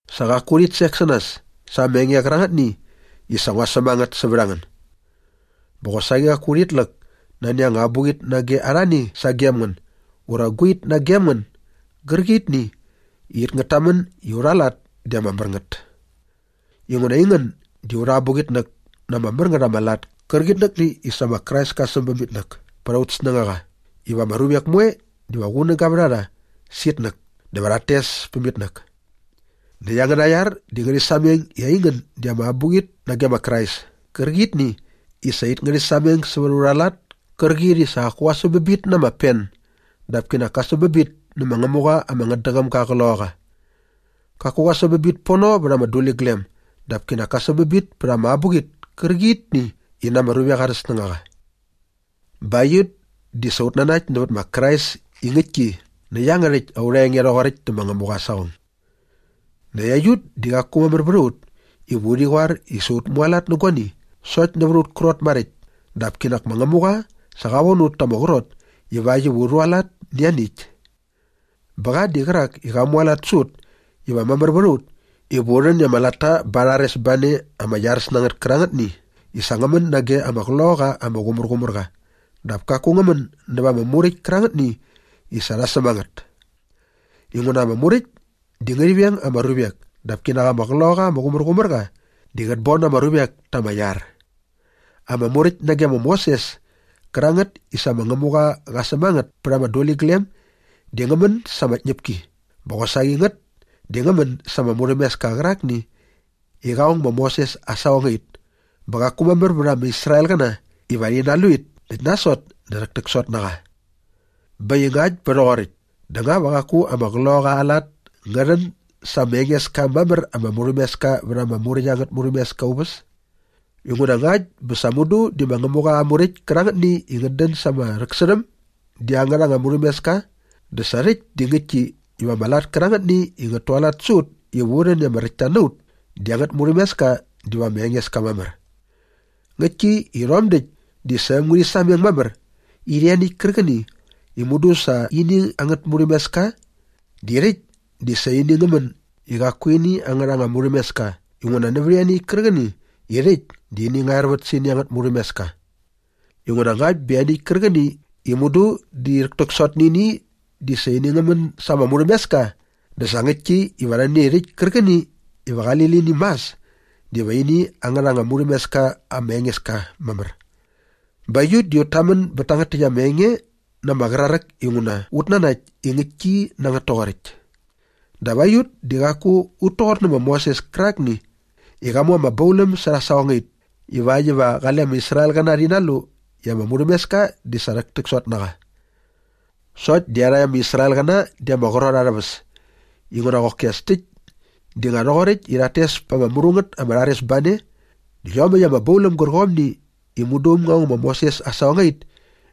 Sa qaku urhit sek sä nas sa ama enge qärangätni i sa ngua säm a ngät sävät a ngän. Bä qosaqi qaku urhit läk nani anga abuqit nage arhani sagem ngän ura guait nagem ngän gärqitni i it ngät tamän i aurha lat di ama mär ngät. Inguna aingän di aurha abuqitnäk na ama mär ngät ama lat kärqitnäkni i sa ma Krais ka säm bäm itnäk pät aut snängaqa iva ama ruvek moe diva qunäga vät a rha sä itnäk dä va rhat tes päm itnäk. Näkt angäna iar di ngärhi sameng i aingän di ama abuqit nage ma Krais kärqitni i sa it ngärhi sameng sävät aurha lat kärqit i sa qaku qa säm a ngät na ama pen dap kinak ka säm a ngät nä ma Ngämuqa ama ngätdäqäm ga aa Qloqaqa. Qaku qa säm a ngät pono vät ama abuqit kärqitni i na ama duliglem dap kinak ka säm a ngät pät ama abuqit kärqitni i na ama ruvek arhä snängaqa. Bä aiut di sa ut nanakt nävät ma Krais i ngäktki nä iangärhäkt aurha enge rhoqoräkt dä ma Ngämuqa aa saqong. Näkt aiut di qaku mamär vät a ut iva urhi qoar i sa ut mualat nä guani sokt nävät aut krot maräkt dap kinak ma Ngämuqa sa qa von ut ta ama qrot ivakt iva u rhualat nä ianiäkt. Bä qa di qärak i qa mualat sä ut iva mamär vät a ut iva u rhän i ama latta ba aa rharesbane ama iaräs na ngät kärangätni i sa ngä män nage ama Qloqaqa ama Qumärqumärqa dap kaku ngä män näva ama Muräkt kärangätni i sa rha säm a ngät. Inguna ama Muräkt di ngärhi veng ama ruvek dap kinak ama Qloqaqa ama Qumärqumärqa di qät bon ama ruvek ta ama iar. Ama Muräkt nage ma Moses kärangät i sa ma Ngämuqa qa säm a ngät pät ama duliglem di ngä män sa ama tñäpki bä qosaqi ngät di ngä män sa ama murhämeska qärakni i qa ong ma Moses aa saqongait bä qaku mamär vät ama Israelqäna iva rhi nalu it näkt nasot dä rhäktäksot na qa. Bä äkt i ngakt bä rhoqoräkt dä nga va qaku ama Qloqaqa aa lat ngä rhän sa ama enges ka mamär ama murhämeska vät ama Muräkt angät murhämeska aa uväs? Inguna ngakt bä sa mudu di ma Ngämuqa aa Muräkt kärangätni i ngät dän sa ama rhäksärhäm di angärha anga murhämeska dä sa rhäkt di ngäktki iva ama lat kärangätni i ngät tualat sä ut iva u rhän i ama räktta na ut di angät murhämeska diva ama enges ka mamär. Ngäktki i rhom däkt di sa äm ngärhi sameng mamär i ianiäkt kärqäni i mudu sa ini angät murhämeska di rhäkt di sa ini ngä män i qaku ini angärha anga murhämeska inguna nävät ianiäkt kärqäni i rhäkt di ini ngä ervät sä ini angät murhämeska. Inguna ngakt bä ianiäkt kärqäni i mudu di rhäktäksot nä ini di sa ini ngä män sa ama murhämeska dä sa ngäktki iva ianiäkt kärqäni iva qali lini mas diva ini angärha anga murhämeska ama enges ka mamär. Bä aiut di ut tamän bät tangät täkt ama enge na ama qraräk inguna ut nanakt i ngäktki na ngät toqoräkt. Dap aiut di qaku ut toqor ma Moses kärakni i qa mu ama bauläm särha aa saqongait ivakt iva qale ama Israelqäna rhi nalu i ama murhämeska di sa rhäktäksot na qa. Sokt di iarhakt ama Israelqäna di ama qrot arhä väs inguna qoki as täkt di nga rhoqoräkt i rhat tes pa ama mru ngät ama rharesbane dä iomäkt ama bauläm gärqomni i mudu äm ngä ong ma Moses aa saqongait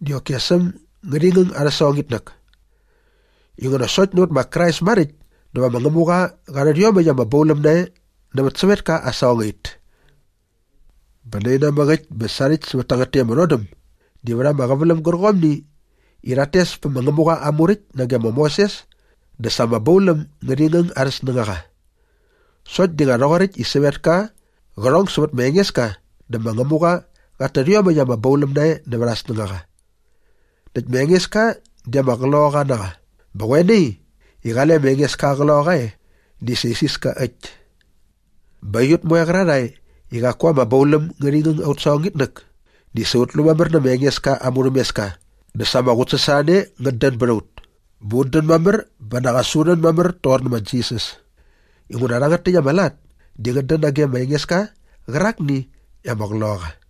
di qoki as äm ngärhi ngäng arhä saqongitnäk. Inguna sokt nävät ma Krais maräkt dä va ma Ngämuqa qa rhät iomäkt ama bauläm nae nävät sävetka aa saqongait. Bä naimäk äkt bä sarhäkt sävät tangät täkt ama rhodäm di vät ama qäväläm gärqomni i rhat tes pä ma Ngämuqa aa Muräkt nage ma Moses dä sa ama bauläm ngärhi ngäng arhä snängaqa. Sokt di nga rhoqoräkt i sävetka qä rhong sävät ma Engeska dä ma Ngämuqa qat tät iomäkt ama bauläm nae nävät aa snängaqa. Näkt ma Engeska di ama Qloqaqa na qa bä qoe nai i qale ma Engeska aa Qloqaqa e di sa isiska äkt. Bä aiut moe qärarhae i qaku ama bauläm ngärhi ngäng aut saqongitnäk di sa ut lu mamär nä ma Engeska aa murhämeska dä sa ama qutsasorhane ngät dän bät a ut bä ut dän mamär bä nak as u rhän mamär toqor ma Jisas. Inguna rhangät täkt ama lat di ngät dän nage ma Engeska qärakni i ama Qloqaqa.